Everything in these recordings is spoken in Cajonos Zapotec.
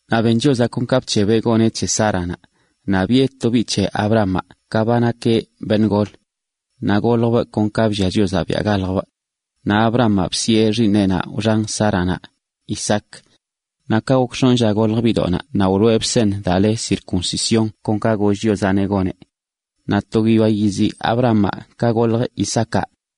Naꞌ ben Chiozaꞌ kon ka bc̱hebeꞌ goneꞌ c̱he Sáranaꞌ, naꞌ biꞌe to biꞌ c̱he Abrahamaꞌ ka ba nakeꞌ beṉꞌ gol. Naꞌ goljbꞌ kon ka bllia Chiozaꞌ biaꞌ galjbꞌ. Naꞌ Abrahamaꞌ bsiꞌe xiiṉeꞌnaꞌ wxan Sáranaꞌ, Isaac. Naꞌ ka gok x̱onꞌ lla goljə biꞌdoꞌnaꞌ naꞌ wloꞌebꞌ seṉ daa le circuncisión kon ka goll Chiozaꞌneꞌ goneꞌ. Naꞌ to guiyoa yizi Abrahamaꞌ ka goljə Isaacaꞌ.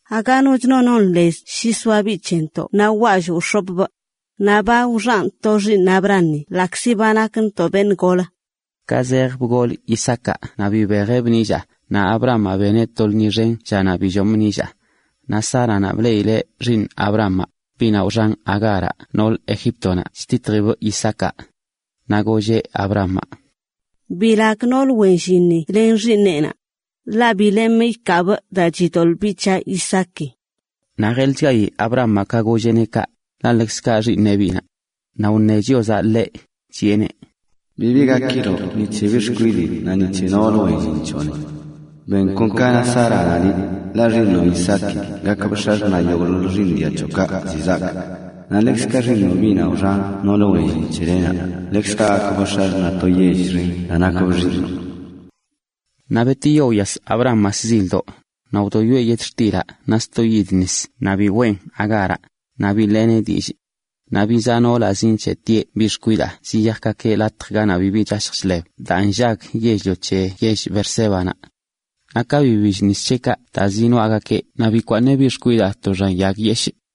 Aga noch no non lez shi soa biꞌ c̱hentoꞌ wwallꞌ wx̱opꞌ. Naꞌ ba wxanꞌ to xiiṉ Abrahami ḻaꞌkzi ba nakntoꞌ beṉꞌ golə.” Ka zej bgol Isaacaꞌ naꞌ bibejeꞌbꞌ nillaa, naꞌ Abrahamaꞌ beneꞌ to lṉi xen llanaꞌ billomꞌ nillaa. Naꞌ Sáranaꞌ bleꞌileꞌ xiiṉ Abrahamaꞌ, biꞌnaꞌ wxan Agáraꞌ nool Egíptonaꞌ, chtitjibꞌ Isaacaꞌ, naꞌ golleꞌ Abrahamaꞌ: “¡Bilag noolə wen llinni len xiiṉeꞌnaꞌ! Ḻaꞌ bi lemꞌ ikaabꞌ daa chidoḻꞌ biꞌ c̱haꞌ Isaaki.” Naꞌ jelchgayi Abrahamaꞌ ka golleꞌneꞌ kaꞌ, ḻaꞌ ḻekzkaꞌ xiiṉeꞌ biꞌnaꞌ. Naꞌ wṉe Chiozaꞌ ḻeꞌ, chiꞌeneꞌ: “Bibi gakiloꞌ ni c̱he biꞌ xkwidii naꞌ ni c̱he noolə wen llin c̱hoꞌni. Ben kon ka na Sáranaꞌ, ḻaꞌ xiiṉoꞌ Isaaki gakbꞌ x̱axṉaꞌ yogꞌḻoḻ xiiṉ dia c̱hoꞌkaꞌ ziꞌ zaak. Naꞌ ḻekzkaꞌ xiiṉoꞌ, biꞌnaꞌ wxan noolə wen llin c̱helenaꞌ, ḻekzkaꞌ gakbꞌ x̱axṉaꞌ to yell xen daa nakbꞌ xiiṉoꞌ.” Naꞌ betiyo wyas Abrahamaꞌ shzildoꞌ, naꞌ wdoyoeꞌ yetxtilaꞌ naꞌ sto yid nis naꞌ biweꞌn Agáraꞌ, naꞌ biḻeeneꞌ dillꞌ. Naꞌ bizaa noolaꞌ zinc̱heꞌtieꞌ biꞌ xkwidaa zjalallꞌgakeꞌ latj ganaꞌ bibi chashj chḻeb daa nllag yell-lio c̱he yell Beersébanaꞌ. Naꞌ ka bibill nis c̱heꞌkaꞌ daa zinoaꞌgakeꞌ naꞌ bikwaaṉeꞌ biꞌ xkwidaa to xan yag yeshꞌ,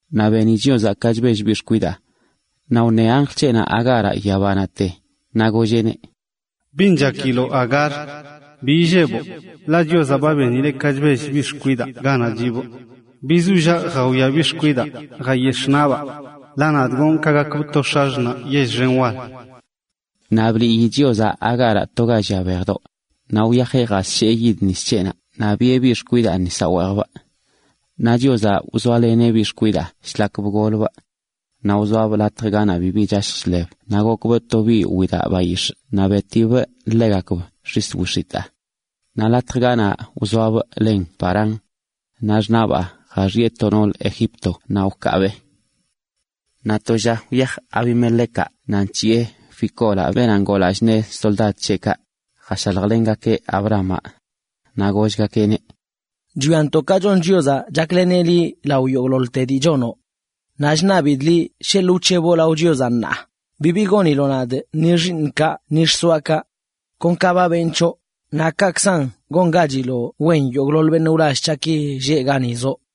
Naꞌ beni Chiozaꞌ ka chbell biꞌ xkwidaa, naꞌ wṉe anjl c̱heꞌnaꞌ Agáraꞌ yabanaꞌte, naꞌ golleꞌneꞌ: “¿Bin chakiloꞌ, Agar? Bi illeboꞌ, ḻaꞌ Chiozaꞌ ba benileꞌ ka chbell biꞌ xkwidaa ganaꞌ chiꞌbꞌ. Bizollaꞌ jawia biꞌ xkwidaa, jayex̱ꞌ naꞌbaa. Ḻaꞌ nadꞌ gonꞌ ka gakbꞌ to x̱axṉaꞌ yell xen wal.” Naꞌ bliꞌyi Chiozaꞌ Agáraꞌ to ga llia bejdoꞌ, naꞌ wyajeꞌ jasshee yid nis c̱heꞌnaꞌ naꞌ biꞌe biꞌ xkwidaa nisaꞌ weejbꞌ. Naꞌ Chiozaꞌ wzoaleneꞌ biꞌ xkwidaa shlak bgolbꞌ. Naꞌ wzoabꞌ latj ganaꞌ bibi chashj chḻeb naꞌ gokbꞌ to biꞌ widaꞌ bayix̱ꞌ naꞌ betibꞌ ḻegakb xis wix̱itaa. Naꞌ latj ganaꞌ wzoabꞌ len Parán. Naꞌ xṉaꞌbaa jaxiꞌe to noolə Egipto naꞌ wkaabee. Naꞌ gok to lla wyaj Abimelecaꞌ naꞌ nc̱hiꞌe Ficolaꞌ, beenaꞌ ngoo lallꞌ naꞌ soldad c̱heꞌkaꞌ, jashaljlengakeꞌ Abrahamaꞌ. Naꞌ gollgakeꞌneꞌ: ―Chwiantoꞌ ka chon Chiozaꞌ chakleneꞌ liꞌ lao yogꞌḻoḻte dii chonoꞌ. Naꞌ chṉabidꞌ liꞌ sheḻꞌ wc̱heboꞌ lao Chiozaꞌ ṉaa, bibi goniloꞌ nadꞌ ni xiiṉꞌkaꞌ ni xsoaꞌkaꞌ. Kon ka ba benꞌ c̱hoꞌ, naꞌ kaꞌkzan gongachiloꞌ wen yogꞌḻoḻ beṉꞌ wlall c̱haꞌki lleꞌ gani zoꞌ.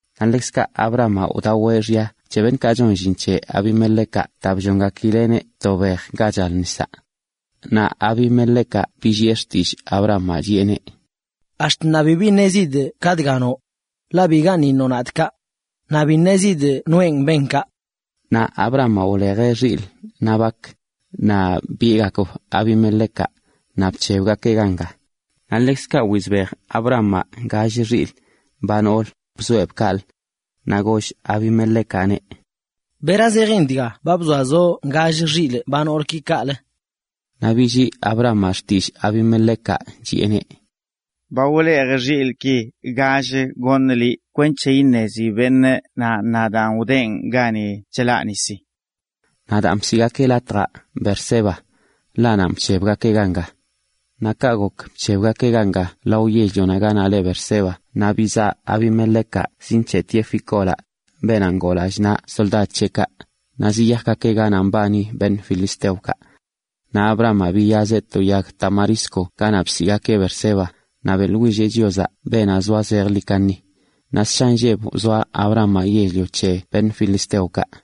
Naꞌ ḻekzkaꞌ Abrahamaꞌ wdaweꞌ xya c̱he beṉꞌkaꞌ chon llin c̱he Abimelecaꞌ daa bllongakileꞌneꞌ to bej ga chal nisaꞌ. Naꞌ Abimelecaꞌ billiꞌe xtillꞌ Abrahamaꞌ, chiꞌeneꞌ: ―Ax̱t ṉaa bibi ṉezidꞌ ka dga noꞌ. Ḻaꞌ bigaṉꞌ iṉoꞌ nadꞌ kaꞌ. Naꞌ bi ṉezidꞌ noenꞌ ben kaꞌ. Naꞌ Abrahamaꞌ wlejeꞌ xilꞌ naꞌ bak, naꞌ biꞌegakb Abimelecaꞌ, naꞌ bc̱hebgakeꞌ ganga. Naꞌ ḻekzkaꞌ wizbej Abrahamaꞌ gall xilꞌ, ba noolə, bzoeꞌb kaꞌlə. Naꞌ goll Abimelecaꞌneꞌ: ―¿Bera zejin dga ba bzoazoꞌ gall xilꞌ ba noolki kaꞌlə? Naꞌ billii Abrahamaꞌ xtillꞌ Abimelecaꞌ, chiꞌeneꞌ: ―Ba wlejꞌ xilꞌki gall goṉꞌ liꞌ kweṉche iṉezi beṉꞌ nan nadꞌ wdenꞌ gani chlaꞌ nisi. Naꞌ daan bsiꞌgakeꞌ latjaꞌ Beerseba. Ḻaꞌ nanꞌ bc̱hebgakeꞌ ganga. Naꞌ ka gok bc̱hebgakeꞌ ganga lo yell-lio ganaꞌ le Beerseba naꞌ bizaꞌ Abimelecaꞌ zinc̱heꞌtieꞌ Ficolaꞌ, beenaꞌ ngoo lallꞌ naꞌ soldad c̱heꞌkaꞌ, naꞌ ziyajgakeꞌ ganaꞌ mbani filisteokaꞌ. Naꞌ Abrahamaꞌ biyazeꞌ to yag tamarisco ganaꞌ bsiꞌgakeꞌ Beerseba, naꞌ beꞌḻwilleꞌ Chiozaꞌ, beenaꞌ zoa zejḻi kaṉi. Naꞌ ssha nlleb wzoa Abrahamaꞌ yell-lio c̱he filisteokaꞌ.